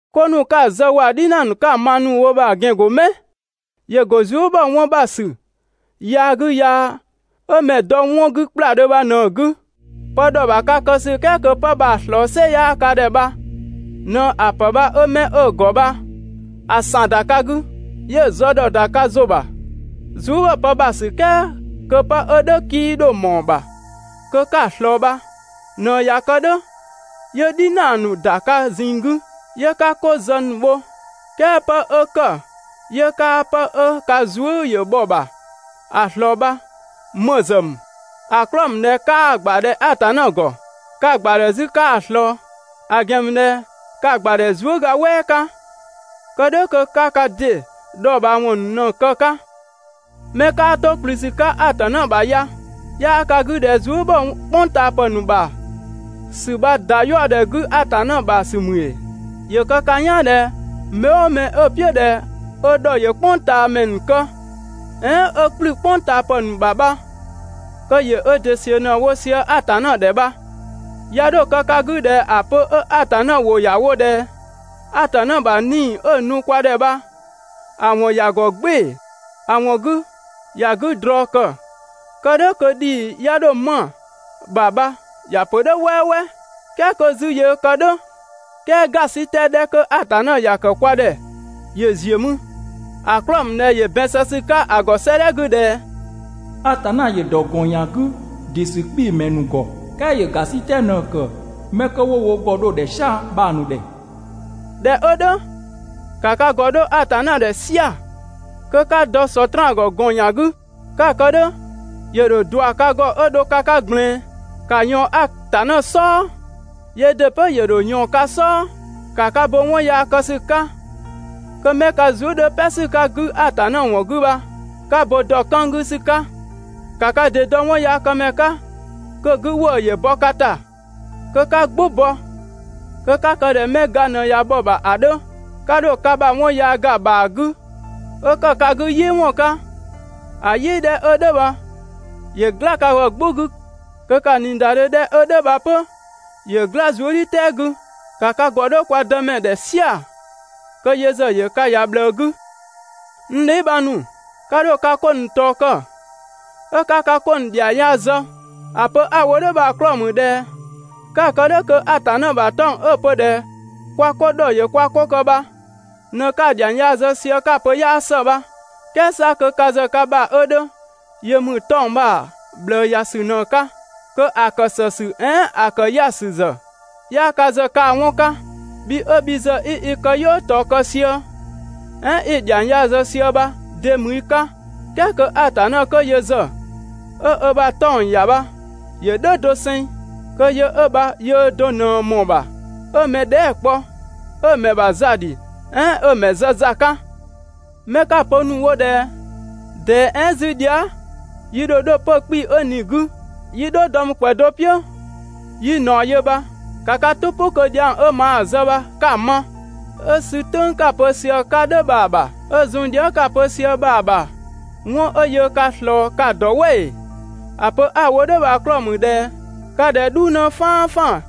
'Ko ‑nu 'ka‑ zë waa‑ "dhinaa ‑nu 'ka‑ ma ‑nu wo bha‑ ‑gɛn ‑go 'mɛ? ‑Yö ‑go zuë" ‑bhɔ 'wɔn ‑bha ‑sü yaa 'gü yaa 'ö mɛ‑ dɔ 'wɔn 'gü ‑kpladhö bha ꞊në‑ 'gü. Pë ‑dhɔ ‑bha ka kë ‑sü "kɛɛ kö 'pë bha‑ ꞊slɔɔ "sɩ 'yaa ka ‑dhɛ bha ꞊në ‑a ‑pë bha 'ö 'mɛ 'ö‑ ‑gɔ bha‑ ‑san ‑da ka 'gü, 'yö‑ zë ‑dhɔ ‑da ka ‑zʋ ‑bha. Zuë" ‑bhɔ pë ‑bha ‑sü "kɛɛ kö 'pë 'ö "dhʋ̈ 'kii 'dho ꞊mɔɔ‑ ‑bha kö 'ka‑ ꞊slɔɔ bha ꞊në ꞊ya kë "dhʋ̈ 'yö "dhinaa ‑nu ‑da ka ꞊zinng 'gü, 'yö 'ka 'ko zë ‑nu bho. "Kɛɛ 'pë 'kö ‑kë 'yö 'kaa 'pë 'ö ka zuë" ‑yö bhɔ‑ ‑bha ‑a ꞊slɔɔ bha ‑më ‑zë ‑mü? ‑A 'klɔɔ‑ ‑mü ꞊dhɛ 'kaa‑ ‑gbadhɛ Atanna ‑gɔ. 'Ka‑ ‑gbadhɛ 'zü 'kaa‑ ꞊slɔɔ, ‑a ‑gɛn ‑mü ꞊dhɛ ka‑ ‑gbadhɛ zuëga "wɛɛ 'ka, kë "dhʋ̈ kö 'ka ka ‑dɩ dhɔɔbhaawɔn ‑nu ꞊në‑ kë‑ 'ka. 'Mɛ 'kaa 'to ‑kplü ‑sü 'ka Atanna ‑bha ‑ya! 'Yaa ka 'gü ꞊dhɛ zuë" ‑bhɔ "kpʋngtaapë ‑nu ‑bha ‑sü bha ‑da 'yaɔdhɛ 'gü Atanna ‑bha ‑sü ‑mü ‑ee? ‑Yö kë ka "yaan ꞊dhɛ mɛ "ʋʋ mɛ 'ö‑ "piʋ̈ ꞊dhɛ ö ‑dhɔ ‑yö "kpʋngtaamɛ ‑nu kë, "ɛɛn 'ö ‑kplü "kpʋngtaapë ‑nu ‑bha bha kö ‑yö ö ‑dɩ ‑siö ꞊në‑ wo sië Atanna ‑dhɛ bha. 'Ya 'dho kë ka 'gü ꞊dhɛ ‑a pö 'ö Atanna ‑wʋ ‑ya wo ꞊dhɛ: «Atanna ‑bha 'Nii‑ 'ö‑ nu kwa ‑dhɛ bha ‑a ‑wɔn ‑ya ‑gɔ "gbɩɩ‑, ‑a ‑wɔn 'gü ‑ya 'gü ‑drɔɔ ‑kë kë "dhʋ̈ kö ‑dhii ꞊ya 'dho 'ma‑ ‑bha bha ‑ya pö "dhʋ̈ "wɛɛwɛɛ.» "Kɛɛ 'kö 'zü yöö kë "dhʋ̈, "kɛɛ ‑gasitɛ 'dhɛ 'kö Atanna ‑ya ‑kë kwa ‑dhɛ ‑yö ‑ziö mü, ‑a 'klɔɔ‑ ‑mü ꞊dhɛ ‑yö ‑bɛn zë ‑sü 'ka ‑a ‑gɔ 'sëëdhɛ 'gü ꞊dhɛ: «Atanna ‑yö ‑dɔ ‑gɔn ‑yan 'gü ‑dɩ ‑sü 'kpii‑ ‑mɛ ‑nu ‑gɔ, "kɛɛ ‑yö ‑gasitɛ ꞊në‑ ‑kë 'mɛ 'kö 'wo wo ‑gɔ dho‑ ‑dhɛ "sia‑ bha‑ ‑nu ‑dhɛ.» ꞊Dhɛ 'ö "dhʋ̈, ‑ka ka ‑gɔ 'dho Atanna ‑dhɛ "sia‑ kö 'ka dɔ Sɔtraan ‑gɔ ‑gɔn ‑yan 'gü. 'Ka‑ kë "dhʋ̈ ‑yö ‑dho ꞊dua ka ‑gɔ 'ö dho ka 'ka ꞊gblɛɛn. ‑Ka ꞊yɔɔn Atanna "sɔɔ, yöö ‑dɩ 'pö ‑yö ‑dho ꞊yɔɔn ka "sɔɔ. ‑Ka ka bo 'wɔn yaa kë ‑sü 'ka, kö 'mɛ ka zuë" 'dhö "pɛ ‑sü 'ka‑ 'gü Atanna ‑wɔn 'gü bha, 'ka bo ‑dɔ 'kën 'gü ‑sü 'ka. ‑Ka ka ‑dɩ dɔ 'wɔnyaakëmɛ 'ka kö‑ 'gü ‑wëë ‑yö bɔ ka ‑ta kö 'ka "gbʋ bɔ, kö 'ka kë ꞊dhɛ 'mɛ ga ꞊nɛ ꞊ya bhɔ‑ ‑bha ‑a 'dhö. ('Ka 'dho ka ‑bha 'wɔn yaa ‑ga ‑bhaa 'gü 'ö ‑kë ka 'gü "yɩɩwɔn 'ka) ‑a "yɩɩ 'dhɛ 'ö "dhʋ̈ bha ‑yö "gla ka ‑gɔ "gbʋ 'gü kö kaa‑ ꞊niidadhe ('dhɛ 'ö "dhʋ̈ bha 'pö) ‑yö "gla zuëdhiʋ̈tɛɛ 'gü. ‑Ka ka ‑gɔ 'dho kwa Dëmɛ ‑dhɛ "sia‑ kö yö ‑zë ‑yö ka ‑ya ꞊bhlëë 'gü. N dheebhang ‑nu, 'ka 'dho ka 'ko ‑nu ꞊tɔɔ kë 'ö 'ka ka 'ko ‑nu ‑dhiang yaa zë. ‑A pö 'a‑ wo "dhʋ̈ bha‑ 'klɔɔ‑ ‑mü ꞊dhɛ 'ka‑ kë "dhʋ̈ kö Atanna ‑bha 'tɔng‑ ('ö‑ pö ꞊dhɛ kwa ‑dhɔ ‑yö kwa 'ko kë bha) ꞊në 'ka‑ ‑dhiang yaa zë sië 'ka‑ pö 'yaa ‑së bha. "Kɛɛ 'sa kö ka ‑zë ka ‑bha 'ö 'dhö yö ‑mü 'tɔng‑ bha‑ ꞊bhlëë ‑ya ‑sü ꞊në‑ 'ka, kö ‑a ‑kë ‑së ‑sü "ɛɛn ‑a ‑kë 'ya‑ ‑sü ‑zë, 'yaa ka ‑zë kaa‑ 'wɔn 'ka. Bhi 'ö bhi ‑zë 'i i këyɔɔ ꞊tɔɔ kë sië, "ɛɛn 'i‑ ‑dhiang yaa ‑zë sië bha de ‑mü i 'ka, "kɛɛ kö Atanna 'kö yö ‑zë 'ö ö ‑bha 'tɔng‑ ‑ya bha ‑yö "dhʋ̈ doseng, kö yö 'ö bha yöö do ꞊në ꞊mɔɔ‑ ‑bha 'ö mɛ dhɛɛ" kpɔ, 'ö‑ ‑mɛ ‑bha za ‑dhi, "ɛɛn 'ö‑ ‑mɛ zë za 'ka? 'Mɛ 'ka‑ pö ‑nu wo ꞊dhɛ: «꞊Dɛɛ "ɛɛn 'zü dhia" yi ‑dho 'dho 'pö‑ 'kpii‑ 'ö ꞊ni‑ 'gü 'yi "dhɔɔ dɔ mü ‑kwɛ do "piʋ̈ 'yi ꞊naɔ yö» bha, ‑ka ka "tʋ "pʋ kö dhiang 'ö maa‑ zë bha 'ka‑ ma. 'Ö sü "tʋ̈ng 'ka‑ pö sië‑ 'ka "dhʋ̈ bha‑ ‑bha 'ö zun dhia" 'ka‑ pö sië bha‑ ‑bha 'wɔn 'ö yöö ka ꞊slɔɔ ka‑ ‑dɔ "wɛ ‑ee? ‑A pö 'a‑ wo "dhʋ̈ bha‑ 'klɔɔ‑ ‑mü ꞊dhɛ ka ꞊dhɛ "dhuu 'në "faanfaan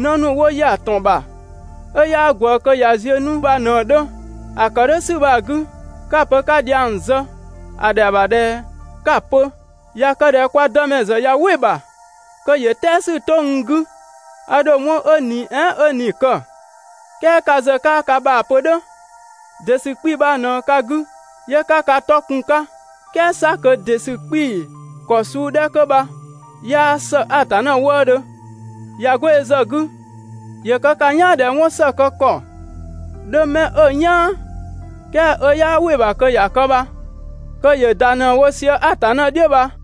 'në ‑nu 'wo ‑ya ‑tɔn ‑bha 'ö 'yaa ꞊gwëë kö ꞊ya ziö 'nu bha ꞊në‑ 'dhö. ‑A ‑kë "dhʋ̈ ‑sü bha‑ 'gü, 'ka‑ pö 'ka dhiang zë, ‑a ‑dhɛa ‑bha ꞊dhɛ 'ka‑ pö: «꞊Ya kë ꞊dhɛ kwa Dëmɛ ‑zë ꞊ya "wɩ‑ ‑bha kö ‑yö "tɛɛ ‑sü 'to n 'gü, a ‑dho 'wɔn 'ö ꞊ni "ɛɛn 'ö ꞊ni‑ kë.» "Kɛɛ ka ‑zë 'kaa ka ‑bha pö "dhʋ̈, ‑dɩ ‑sü 'kpii‑ bha ꞊në ka 'gü 'yö 'ka ka 'tɔ kun‑ 'ka, "kɛɛ 'sa kö ‑dɩ ‑sü 'kpii‑ ‑kɔ suu 'dhɛ 'kö bha 'yaa ‑së Atanna wëëdhö. ꞊Ya 'go yö ‑zë 'gü, ‑yö kë ka "yaan ꞊dhɛ 'wɔn ‑së kë ‑kɔ 'dhö 'mɛ 'ö‑ "yaan, "kɛɛ 'ö 'yaa "wɩ‑ ‑bha kö ‑ya kë bha kö ‑yö ‑da ꞊në‑ wo sië Atanna "dhiʋ̈ bha.